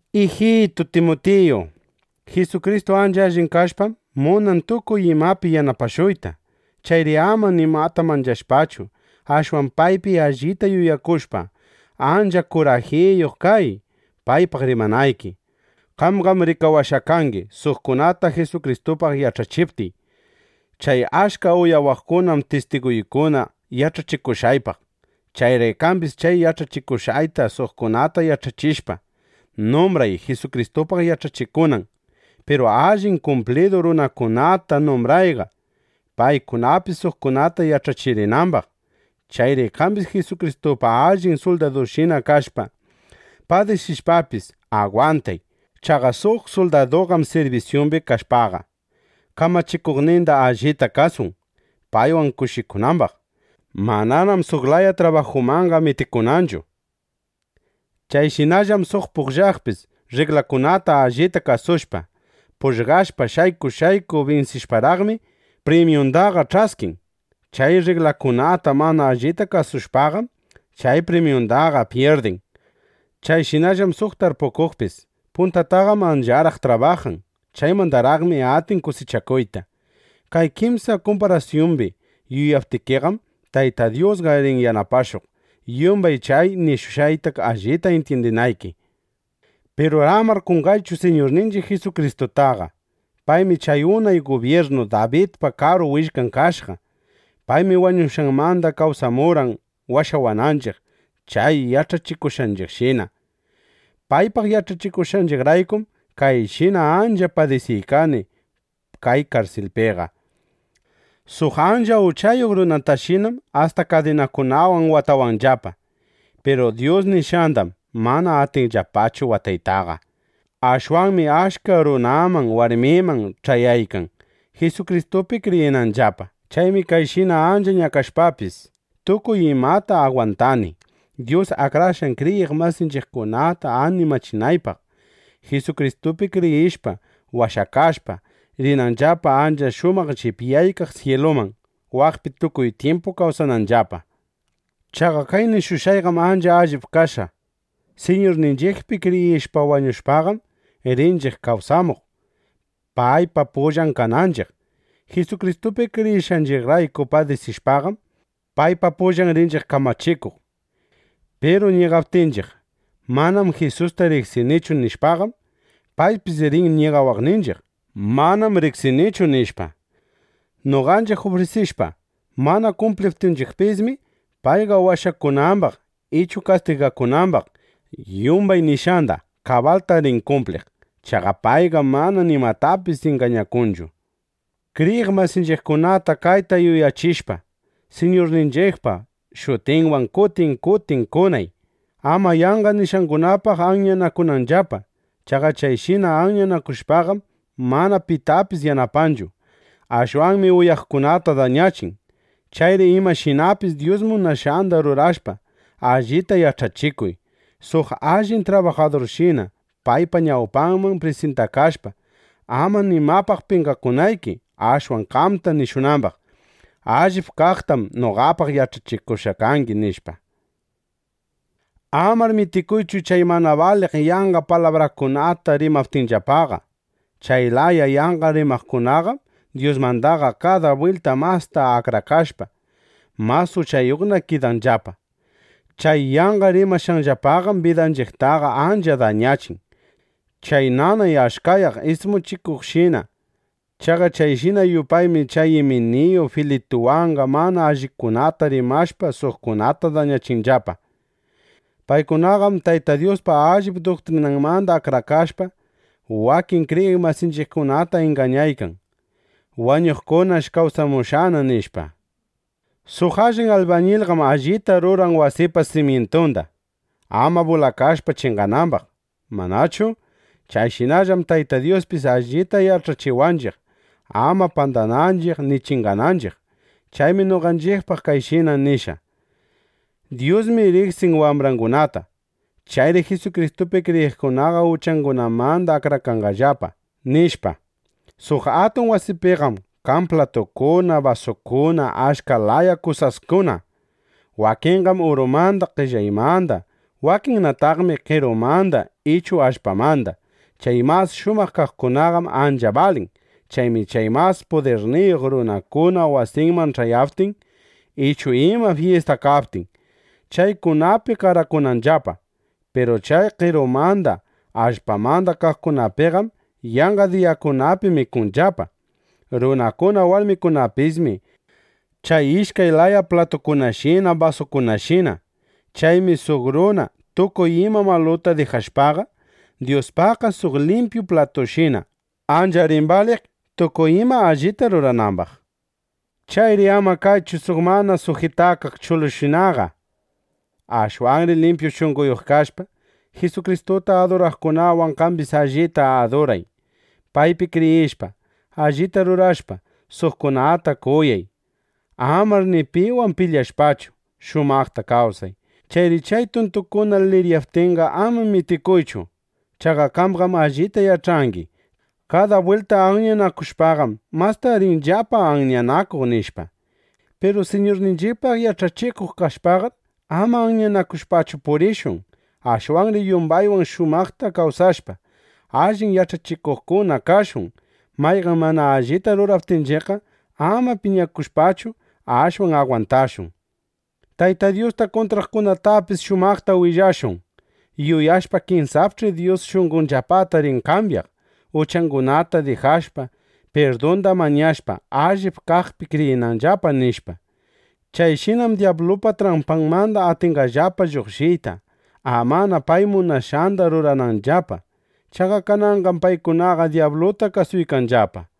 Ijitu Timutiyu, Jisukristu ancha allin kashpam, munan tukuy imapi yanapashuyta. Chayri ama nimata manchashpachu, ashwan paypi allita yuyakushpa, ancha kurajiyuq kay, paypaq rimanayki. Qamqam rikawashqa kangi, suqkunata Jisukristupaq yach'achiptiy. Chay achka uyawaqkunam tistiguykuna yach'achikushqaypaq. Chayri qambis chay yach'achishushqayta suqkunata yach'achishpa, numbray, Jisukristupaq yach'achikunan. Piru allin kumplidu runakunatar numbrayqa, paykunapis suqkunata yach'achirinambaq. Chayri qambis Jisukristupa allin suldadunshina kashpa, padisishpapis, agwantay. Chaqa suq suldaduqam sirbisyumbi kashpaqa, kamachikuqninda allita kasun, paywan kushikunambaq. Mananam suq laya trabajumanqa mitikunnachu. Chayshinallam suq pugllaqpis rriglakunata allita kasushpa, pugllashpa, shayku shayku binsishparaqmi, primyundaqa ch'askin. Chay rriglakunata mana allita kasushpaqam, chay primyundaqa pyirdin. Chayshinallam suq tarpukuqpis. Puntataqam ancharaq trabajan. Chaymandaraqmi atin kusichakuyta. Kay kimsa kumparasyumbi yuyaptikiqam, Tayta Dyusqa rin yanapashuq, yumbay chay nishushqayta allita intyindinayki. Piru amar qonqaychu Siñurninchiq Jisukristutaqa. Paymi chay unay gubyirnu Dabidpa karu willkan kashqa. Paymi wañushqanmanda kawsamurqan washawananchiq chay yach'achishushqayshina. Paypaq yach'achikushqayraykum, kayshina ancha padisiykani kay karsilpiqa. Suq ancha uchayuq runatashinam asta kadinakunawan watawanllapa. Piru Dyus nishqandam mana atinllapachu wataytaqa. Ashwanmi achka runaman warmiman ch'ayaykan, Jisukristupi kriyinanllapa. Chaymi kayshina ancha ñakashpapis, tukuy imata agwantani, Dyus akrashqan kriyiq masitanchiqkunata animachinaypaq, Jisukristupi kriyishpa, washakashpa, rinanllapa ancha shumaq llipyaykaq syiluman, waqpi tukuy tyimpu kawsananllapa. Chaqa kay nishushqayqam ancha allip kashqa: Siñurninchiqpi kriyishpa wañushpaqam, rinchiq kawsamuq, paypa pullan kananchiq. Jisukristupi kriyishqanchiqrayku padisishpaqam, paypa pullan rinchiq kamachikuq. Piru ñigaptinchiq: “Manam Jisusta riqsinichu”, nishpaqam, paypis rin ñigawaqninchiq: “Manam riqsiykichu”, nishpa. Noqanchiq ufrisishpa, mana kumpliptinchiqpismi, payqa washakunambaq ichu kastigakunambaq, yumbay nishqanda kabalta rin kumpliq. Chaqa payqam mana nimatapis ingañakunchu. Kriyiq masinchiqkunata kayta yuyachishpa, Siñurninchiqpa shutinwan kutin kutin kunay, ama yanqa nishqangunapaq anyanakunanllapa. Chaqa chayshina anyanakushpaqam, mana pitapis yanapanchu. Ashwanmi uyaqkunata dañachin. Chayri imashinapis Dyus munashqanda rurashpa, allita yach'achikuy, suq allin trabajadurshina paypa ñawpanman prisintakashpa, ama nimapaq penqakunayki, ashwan qamta nishunambaq: “Allip kaqtam noqapaq yach'achikushqa kangi”, nishpa. Amar mitikuychu chay mana baliq yanqa palabrakunata rimaptinllapaqa. Chay laya yanqa rimaqkunaqam Dyusmandaqa kada bwilta masta akrakashpa, mas uchayuqna kidanllapa. Chay yanqa rimashqanllapaqam bidanchiqtaqa ancha dañachin, chay nanay achkayaq ismuchikuqshina. Chaqa chayshina yupaymi chay Iminiyu Filituwanqa mana allikunata rimashpa suqkunata dañachinllapa. Paykunaqam Tayta Dyuspa allip duktrinanmanda akrakashpa, wakin kriyiq masinchiqkunata ingañaykan: “Wañuqkunash kawsamushqana”, nishpa. Suq allin albañilqam allita ruran wasipa simyintunda, ama bulakashpa chinganambaq, ¿manachu? Chayshinallam Tayta Dyuspis allita yach'achiwanchiq, ama pandananchiq ni chingananchiq. Chaymi noqanchiqpaq kayshina nishqa: “Dyusmi riqsin wambrangunata. Chayri Jisukristupi kriyiqkunaqa uchakunamanda akrakanqallapa”, nishpa. Suq atun wasipiqam kan platukuna, basukuna, achka laya kusaskuna. Wakinqam urumanda, qellaymanda. Wakinnataqmi qerumanda ichu allpamanda. Chay mas shumaq kaqkunaqam ancha balin. Chaymi chay mas pudirniyuq runakuna wasinman ch'ayaptin, ichu ima fyista kaptin, chaykunapi qarakunllapa. Piru chay qerumanda, allpamanda kaqkunapiqam yanqa diyakunapi mikunllapa. Runakuna warmikunapismi chay ishkay laya platukunashina basukunashina. Chaymi suq runa tukuy ima maluta dijashpaqa, Dyuspaqqa suq limpyu platushina ancha rin baliq, tukuy ima allita ruranambaq. Chayri ama kaychu suq mana sujitakaq chulushinaqa. Ashwanri limpyu shunqoyuq kashpa, Jisukristuta aduraqkunawan qambis allita aduray. Paypi kriyishpa, allita rurashpa, suqkunata kuyay. Amar ni piwan pilyashpachu, shumaqta kawsay. Chayri chay tuntukuna liriyaptinqa, ama mitikuychu. Chaqa qamqam allita yach'angi: Kada bwilta anyanakushpaqam, masta rinllapa anyanakuq, nishpa. Piru Siñurninchiqpaq yach'achikuq kashpaqar, ama anyanakushpachu purishun. Ashwanri yumbaywan shumaqta kawsashpa, allin yach'achikuqkuna kashun. Mayqan mana allita rurawaptinchiqqa, ama piñakushpachu, ashwan agwantashun. Tayta Dyusta kuntraqkunatapis shumaqta willashun, yuyashpa: Kinsapch'i Dyus shunqonllapata rin kambyaq, uchangunata dijashpa, pirdunda mañashpa, allip kaqpi kriyinanllapa, nishpa. Chayshinam dyablupa trampanmanda atinqallapa lluqshiyta, amana pay munashqanda rurananllapa. Chaqa kananqam paykunaqa dyabluta kasuykanllapa.